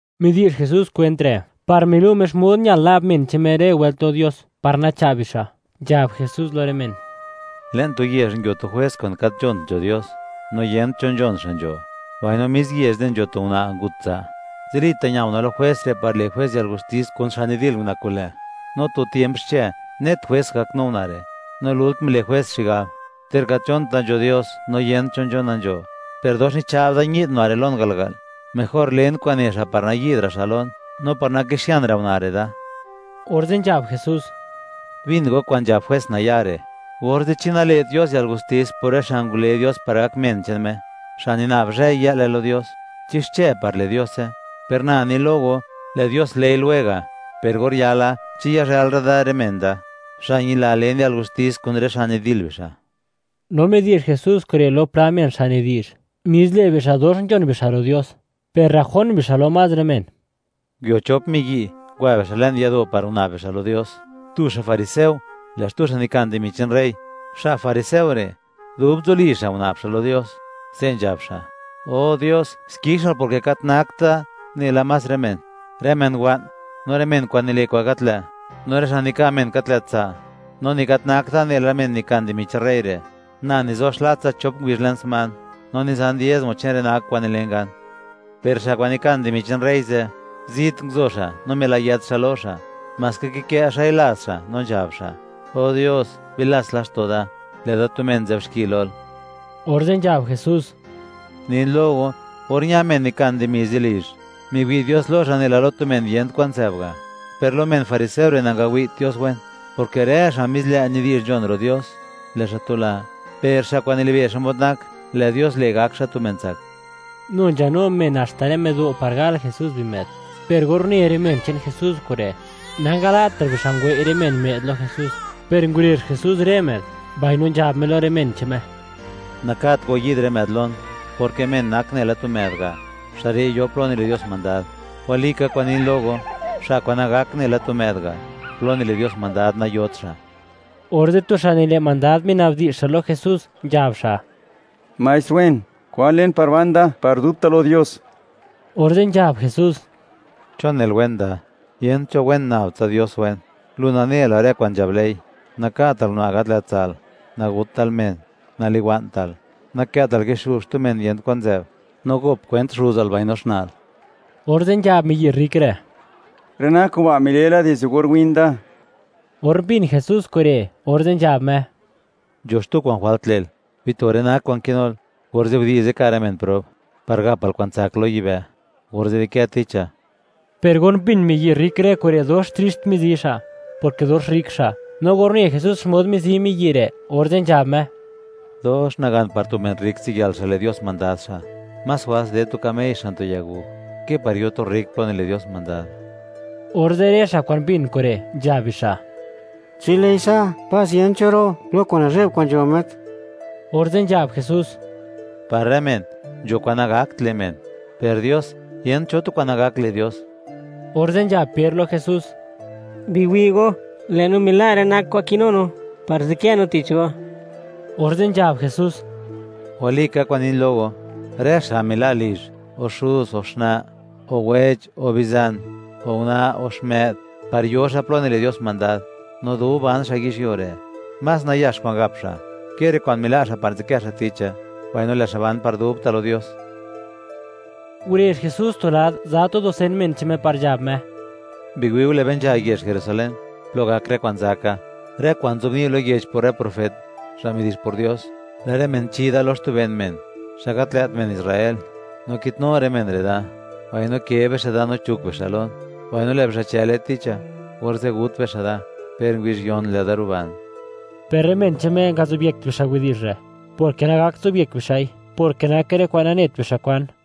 Midi'zh Jesús kwent re', par milu' Me xmod ñal na'b men che'n Me rë wëlt lo Dios, par nacha'b bixa', nzhab Jesús lo rë men: ―Le'n tu yezh nguio tu jwes kwa'n gat nzhont nzho Dios, no niyent cho nzhon xa' nzho, mbaino mis yezh ze' nzho tu una' ngut tsa'; zilita' ña una' lo jwes re' par le' jwes yalgustis kun xa' nidil una' kun lë'. No tu tiemp xche, net jwes ngaknu una' re', no lult mile' jwes xigab: “Ter gat nzhonta nzho Dios, no yent cho nzhona nzho, per dox nicha'b da ñi'd una' re' lon garga'l; mejor len kwa'n ne xa' par nayi'dra' xa' lon, no par nakixianra' una' re' da.” Orze' nzhab Jesús: ―Bin go kwa'n nzhab jwes naya' re'; orze', ¿chi nale't Dios yalgustis por rë xa' ngule Dios par gak men che'n Me, xa' nina'b zhëy-yë'le lo Dios? ¿Chi xche par le' Diose? Per na ni lo go, lë' Dios le'i lwega'. Per or yala, ¿chi yazhëlra' da rë men da, xa' ñila len yalgustis, kun rë xa' nidil bixa'? No midi'zh Jesús kure', lo pla men xa' nidi'zh, mis lë' bixa' dox nzhon bixa' ro' Dios, per rrajón bixa' lo más rë men: ―Nguio chop miyi', ngwa bixa' le'n yado' par guna'b bixa' lo Dios. Tu xa' fariseo, lë' xtu xa' nikan dimi che'n rey. Xa' fariseo re', dub nzuli xa', guna'b xa' lo Dios, se' nzhab xa': “O Dios; xkixal porke gat nakt da nela más rë men; rë men wa'n, no rë men kwa'n nile' kwa'n gat lë', no rë xa' nika' men gat lë't tsa'; no ni gat nakt da nela men nikan dimi che'n rey re'; na nizo xlatsa chop ngubizh le'n sman, no nizan diezmo che'n rë nak kwa'n nilen gan.” Per xa' kwa'n nikan dimi che'n rey ze', zit nguzo xa', no milayët xa' lo xa', maska kikë' xa'i laz xa', no nzhab xa': “¡O Dios, bilats laxto' da, lë'da tu men nzë'b xki lol!” Orze' nzhab Jesús: ―Nin lo go, or ña men nikan dimi ze' lizh, miwi' Dios lo xa', nela lo tu men yent kwan nzë'b ga'; per lo men fariseo re', nangawi't Dios wen, porke rë xa' mis lë' nidi'zh nzhon ro' Dios, lë' xa' tula; per xa' kwa'n nilibe' xmod nak, lë' Dios le', gak xa' tu men tsak. Nu nzhanu men, haxta rë më'do', par gal Jesús bimë'd, per or une rë men che'n Jesús kure', nangala'tra' bixa' ngwei' rë men më'd lo Jesús, per ngurezh Jesús rë më'd, mbaino nzhab Me lo rë men che'n Me: ―Nakat go yi'd rë më'd lon; porke men nak nela tu më'd ga', xa' re' yo plo nile' Dios mandad. Walika kwa'n nin lo go; xa' kwa'n nagak nela tu më'd ga', plo nile' Dios mandad nayot xa'. Orze' tu xa' nile' mandad, minabdi'zh lo Jesús, nzhab xa': ―Maestr wen, ¿kwan len par ban da par dubta' lo Dios? Orze' nzhab Jesús: ―¿Chon nel wen da? Yent cho wen, nab tsa Dios wen. Lu nane la rë kwa'n nzhab ley: “Naka'tal una' gat lë't tsa'l, nagutal men, naliwa'ntal, nakë'tal kixu' xtu men yent kwan nzë'b, no gop kwent xuzal mbaino xna'l.” Orze' nzhab miyi' rrik re': ―Rë nak kuba' milela dizde or win da. Or mbin Jesús kure', orze' nzhab Me: ―Nzho xtu kwa'n jwalt le'l: Bito rë nak kwa'n kinul, orze' gudi'ze ka' rë men prob, par gapal kwa'n tsak lo yibë', orze' di'kë ticha. Per or mbin miyi' rrik rë kure', dox trixt mizi xa', porke dox rrik xa'. No or une Jesús, xmod mizi miyi' re', orze' nzhab Me: ―¡Dox nagan par tu men rrik ziyël xa' le' Dios mandad xa'! Más jwals ded tu kamey xan tu yaguj, ke par yo tu rrik plo nile' Dios mandad. Orze', rë xa' kwa'n mbin kure', nzhab bixa': ―Chi lë'i sa', ¡pas yent cho ro' lo kwa'n nazhe'b kwa'n nzho met! Orze' nzhab Jesús: ―Par rë men, nzho kwa'n nagakt le' men; per Dios, yent cho tu kwa'n nagakt le' Dios. Orze' nzhab Per lo Jesús: ―Biwi' go, lë' no mila' rë nak kwa'n kinu no, par nzadkë no tich go. Orze' nzhab Jesús: ―Walika kwa'n nin lo go, rë xa' mila' lizh, o xuz, o xna', o wech, o bizan, o una', o xmë'd, par yo xa' plo nile' Dios mandad; no dub ban xa' yizhyuo re', más nayax kwa'n gap xa', ke rë kwa'n mila' xa' par nzadkë xa' ticha, mbaino lë' xa' ban par dubta' lo Dios. Ngurezh Jesús tu lad, za tu dusen men che'n Me par nzhab Me: ―Biwi'u, lë'be nzha yezh Jerusalén, plo gak rë kwa'n zaka, rë kwa'n nzobni' lo yech por rë profet, xa' midi'zh por Dios; lë' rë men chi da lo xtu ben men, xa' gat lë't men Israel, no kitnu rë men re' da, mbaino ke bixa' da, no chuk bixa' lon. Mbaino lë' bixa' chële ticha, orze' gut bixa' da; per ngubizh yon lë'da ruban. Per rë men che'n Me ngazobyekt bixa' widi'zh re'; porke nagakt zobyek bixa'i, porke nake rë kwa'n nanet bixa' kwan.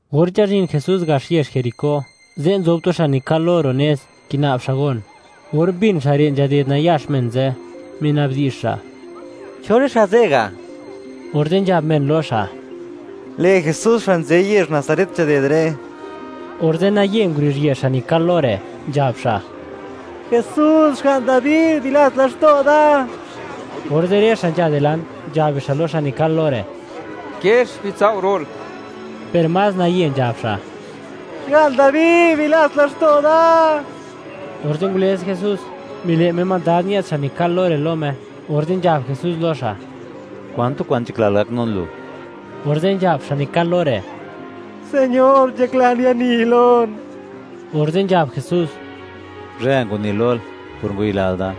Or nzhazhin Jesús gax yezh Jericó, ze' nzob tu xa' nikal lo ro' nez, kina'b xa' gon. Or mbin xa' re', nzhaded nayax men ze', minabdi'zh xa': “¿Cho rë xa' ze' ga'?” Orze' nzhab men lo xa': ―Lë' Jesús xa' nzë yezh Nazaret nzhaded re'. Orze' naye nguruzhië xa' nikal lo re', nzhab xa': ―¡Jesús, Xga'n Dabi! ¡Bilats laxto' da! Orze' rë xa' nzha dilant, nzhab bixa' lo xa' nikal lo re': “¡Kiex, bitsao' ro'l!”, per más naye nzhab xa': ―Xga'n Dabi, ¡bilats laxto' da! Orze' ngulëz Jesús, mile' Me mandad ñë'd xa' nikal lo re' lo Me, orze' nzhab Jesús lo xa': ―¿Kwan tu kwa'n nzhaklal gaknun lu? Orze' nzhab xa' nikal lo re': ―Señor, nzhaklan yani lon. Orze' nzhab Jesús: ―¡Guzhë ngwani lol!, por ngwayilal da.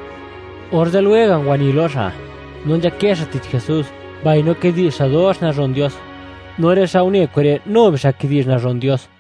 Orze' lwega' ngwani lo xa', no nzhakë xa' tich Jesús, mbaino kidi'zh xa' dox nazhon Dios; no rë xa' une kure', nu bixa' kidi'zh nazhon Dios.